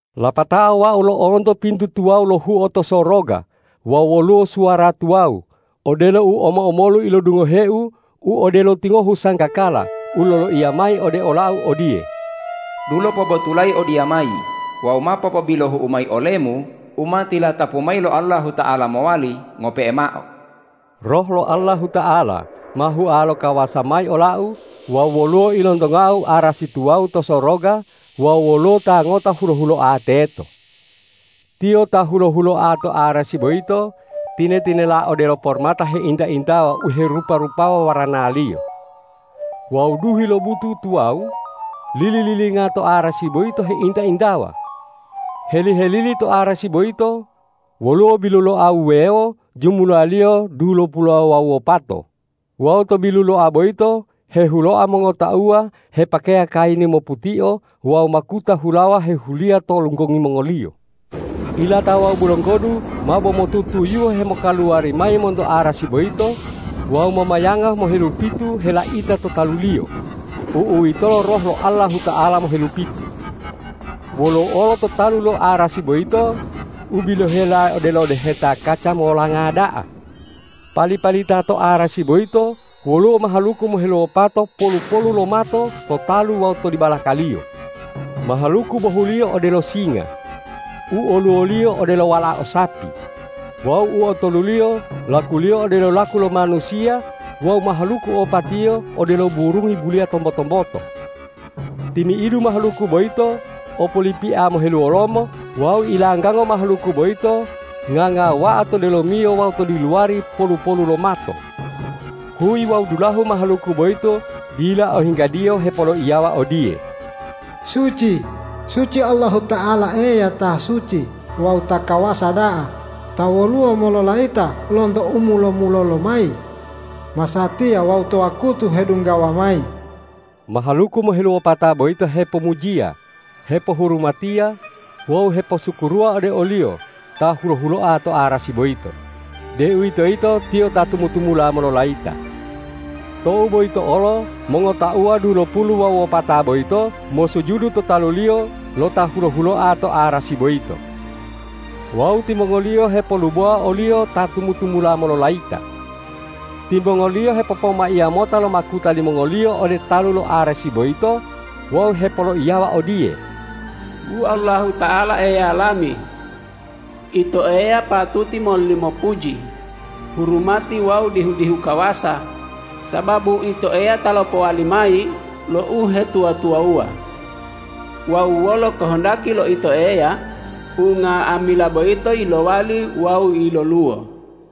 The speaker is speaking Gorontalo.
Lapatao wau lo'onto pintu tuwawu lohuo to soroga wawu woluwo suwara tuwawu, odelo u omo-omolu ilodungoheu u odelo tingohu sanggakala u loloiya mayi ode ola-U odiye,”Dulo pobotulayi odiyamayi wawu ma popobilohu'u mayi olemu u ma tilatapu mayi lo Allahuta'ala mowali ngope'e mao.” Roh lo Allahuta'ala ma hua lo kawasa mayi olau wawu woluwo ilontongau arasi tuwawu to soroga wawu woluwo Ta ngota hulo-huloa teto. Tiyo ta hulo-huloa to arasi boyito tine-tinela odelo pormata heinta-intawa u herupa-rupawa waranaliyo. Wawu duhi lo butu tuwawu lili-lilinga to arasi boyito heinta-intawa. Heli-helili to arasi boyito woluwo biluloa wuwewo jumulaliyo dulopulu wawu wopato wawu to biluloa boyito hehuloa mongotauwa hepakeya kayini moputio wawu makuta hulawa hehuliya to lunggongi mongoliyo. Ilata wawu bulonggodu mabo motutuyuhe hemokaluwari mayi monto arasi boyito wawu momayanga mohelupitu helaita to taluliyo, u'uwitolo Roh lo Allahuta'ala mohelupitu. Woluwo olo to talu lo arasi boyito u bilohela odelo deheta kaca molanga da'a. Pali-palita to arasi boyito woluwo mahaluku moheluwopato polu-polu lo mato to talu wawu to dibalakaliyo. Mahaluku bohuliyo odelo singa, u oluwoliyo odelo walao sapi, wawu u otoluliyo lakuliyo odelo laku lo manusiya wawu mahaluku opatiyo odelo burungi buliya tombo-tomboto. Timi'idu mahaluku boyito o polipia moheluwolomo wawu ilanggango mahaluku boyito ngangawa'a to delomiyo wawu to diluwari polu-polu lo mato. Huyi wawu dulahu mahaluku boyito dila ohinggadiyo hepoloiyawa odiye,”Suci, suci Allahuta'ala Eya ta suci wawu ta kawasa da'a ta woluwo mololayita lonto u mulo-mulolo lomayi, masatiya wawu to wakutu hedunggawa mayi.” Mahaluku moheluwopata boyito hepomujiya, hepohurumatiya wawu heposukuruwa ode o-Liyo Ta hulo-huloa to arasi boyito, deuwitoyito Tiyo ta tumu-tumula mololayita. Tou boyito olo mongotauwa dulopulu wawu wopata boyito mosujudu to talu-Liyo lo Ta hulo-huloa to arasi boyito. Wawu timongoliyo hepolubowa o-Liyo ta tumu-tumula mololayita. Timongoliyo hepopomaiya mota lo makuta limongoliyo ode talu lo arasi boyito wawu hepoloiyawa odiye, ”Wu Allahuta'ala Eya lami! Ito Eya patuti mololimo puji, hurumati wawu dihu-dihu kawasa, sababu Ito Eya ta lopowali mayi lo uhetuwa-tuwawuwa. Wawu wolo kohondaki lo Ito Eya unga'amila boyito yilowali wawu yiloluwo.”